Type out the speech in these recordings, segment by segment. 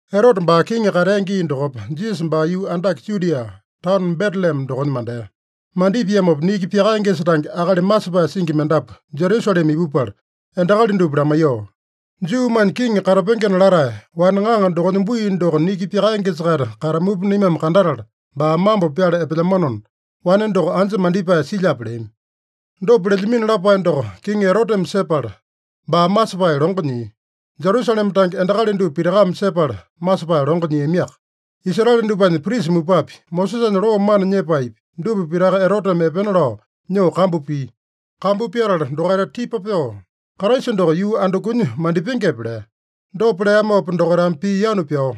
Erote baa kiŋi katea gii dokopa, Jisasa baa yuu andake Judia, taono Betelema dokonya mandea. Mandipiamopa niki pyakaengesa tange akali masepae singi mendapu Jerusalema ipupala, endakali dupa lamaiyoo, “Juumanya kiŋi katapengena latae, wane ŋaŋa dokonya bui doko niki pyakaengesa-kaita katamupa naimame kandatala, baa mambo pyala epelyamanona, wane doko anja mandipae silyape?” leami. Dopa lelyamino lapae doko Kiŋi Eroteme sepala, baa masepae longo nyia. Jerusalema tange endakali dupa pitakame sepala, masepae longo nyiamiaka. Israele dupanya prisa mupapi, Mosesanya loo mana nyepaepi, dupa pitaka Eroteme epena lao nyoo kambu pia. Kambu pyatala dokaita tipa pyoo, “Kraisa doko yuu andukunya mandipengepe?” lea. Dopa leamopa dokaitame pii yanu pyao,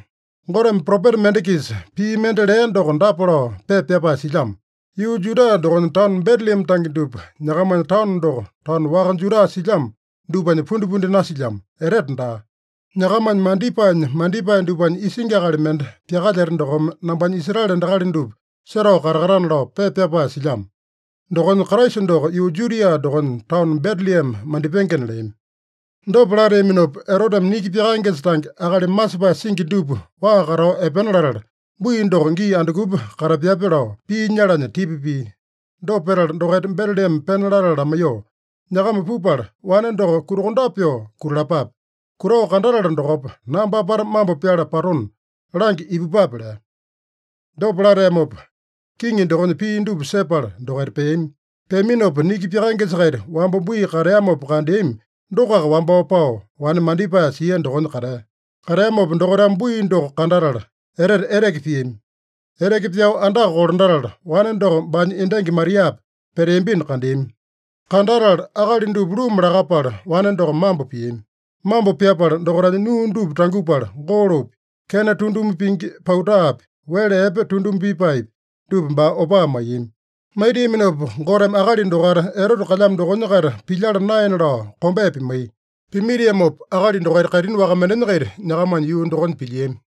“Goteme propeta mende-kisa pii mende lea doko dapa lao pepa pyapae silyamo: ‘Yuu Juda dokonya taono Betelema tange dupa, nyakamanya taono doko taono waka Juda silyamo dupanya pundipundi nasilyamo, etete daa. Nyakamanya mandipaenya mandipae dupanya isingi akali mende pyakalyeta dokome nambanya Israele endakali dupa setao katakatana’ lao pepa pyapae silyamo. Dokonya, Kraisa doko yuu Judia dokonya taono Betelema mandipengena” leami. Dopa lateaminopa, Eroteme niki pyakaengesa tange akali masepae singi dupa waa katao epena latala, bui doko gii andukupa katapyape lao pii nyalanya tipa pia. Dopa petala, dokaita Betelema pena latala lamaiyoo, “Nyakama pupala, wane doko kutakondape pyoo kutalapape. Kutao kandatala dokopa, nambame apata mambo pyala patona, langya ipupape” lea. Dopa lateamopa, kiŋi dokonya pii dupa sepala dokaita peami. Peaminopa, niki pyakaengesa-kaita wamba bui kateamopa kandeami dokoaka wambao pao, wane mandipae sia dokonya katea. Kateamopa dokaitame bui doko kandatala, etete eteke piami. Eteke pyao andaka kolandatala, wane doko baanya endangi Mariapa peteambino kandeami. Kandatala akali dupa luma lakapala, wane doko mambo piami. Mambo pyapala, dokaitanya nuu dupa tangupala, golopi, kena tunduma pingi pautapi, wele epe tunduma pipaepi, dupa baa opaa maiyami. Maitiaminopa Goteme akali dokaita Erote kalyamo dokonya-kaita pilyala naena lao kombea pimaiya. Pimaitiamopa akali dokaita kaitini waka mendenya-kaita nyakamanya yuu dokonya pilyiami.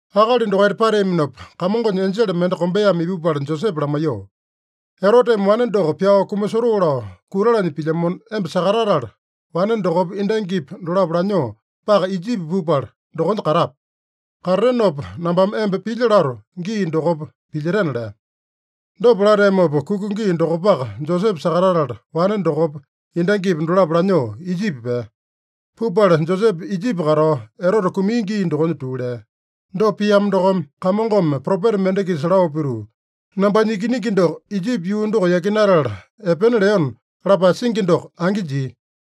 Akali dokaita pateaminopa, Kamongonya enjele mende kombeame ipupala Josepe lamaiyoo, “Eroteme wane doko pyao kumasotoo lao kutalanya pilyamona, emba sakatatala, wane dokopa, endangipa dolapo lanyoo paka Ijipi pupala, dokonya katape. Katatenopa, nambame emba pilya lato gii dokopa pilyetena” lea. Dopa lateamopa, kuka gii dokopaka Josepe sakatatala, wane dokopa, endangipa dolapo lanyoo Ijipi pea. Pupala Josepe Ijipi katao, Erote kumia gii dokonya tuu lea. Dopa piamo dokome, Kamongome propeta mende-kisa lao pituu, “Nambanya ikiningi doko Ijipi yuu doko yakinatala epena leona” lapae singi doko angi jia.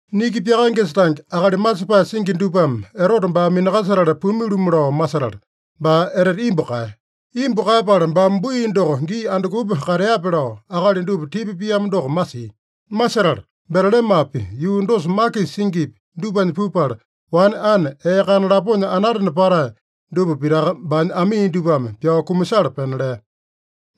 Niki pyakaengesa tange akali masepae singi dupame Erote baa minakasetala pumi-lumu lao masetala, baa etete imbu kaeya. Imbu kaeyapala baame bui doko gii andukupa kateape lao, akali dupa tipa piamo doko masia. Masetala Betelemapi, yuu dosa makisa singipi, dupanya pupala, wane ane ee kana laponya anatena patae dupa pitaka baanya amii dupame pyao kumasala pena lea.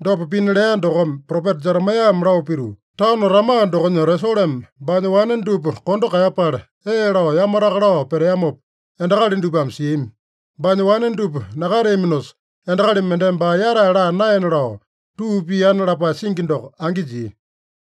Dopa pina lea dokome, propeta Jeremaeyame lao pituu, “Taono Rama dokonya Resolome baanya wane dupa kondo kaeyapala ee lao yamataka lao peteamopa, endakali dupame siami. Baanya wane dupa nakateaminosa, endakali mendeme baa yatae laa naena lao tuu piana” lapae singi doko angi jia.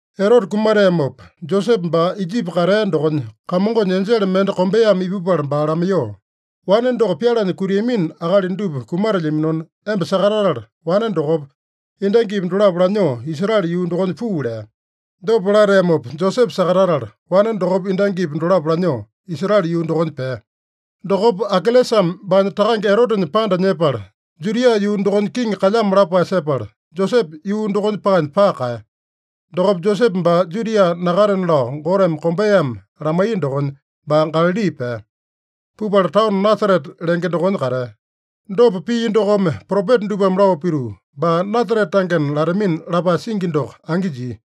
Erote kumateamopa, Josepe baa Ijipi katea dokonya, Kamongonya enjele mende kombeame ipupala baa lamaiyoo, “Wane doko pyalanya kutiamino akali dupa kumatelyaminona, emba sakatatala, wane dokopa, endangipa dolapo lanyoo Israele yuu dokonya puu” lea. Dopa lateamopa Josepe sakatatala, wane dokopa endangipa dolapo lanyoo Israele yuu dokonya pea. Dokopa Akelesame baanya takange Erotenya panda nyepala, Judia yuu dokonya kiŋi kalyamo lapae sepala, Josepe yuu dokonya paanya paka kaeya. Dokopa Josepe baa Judia nakatena lao Goteme kombeame lamaiya dokonya, baa Galali pea. Pupala taono Nasarete lenge dokonya katea. Dopa pia dokome, propeta dupame lao pituu, “Baa Nasarete tangena latamina” lapae singi doko angi jia.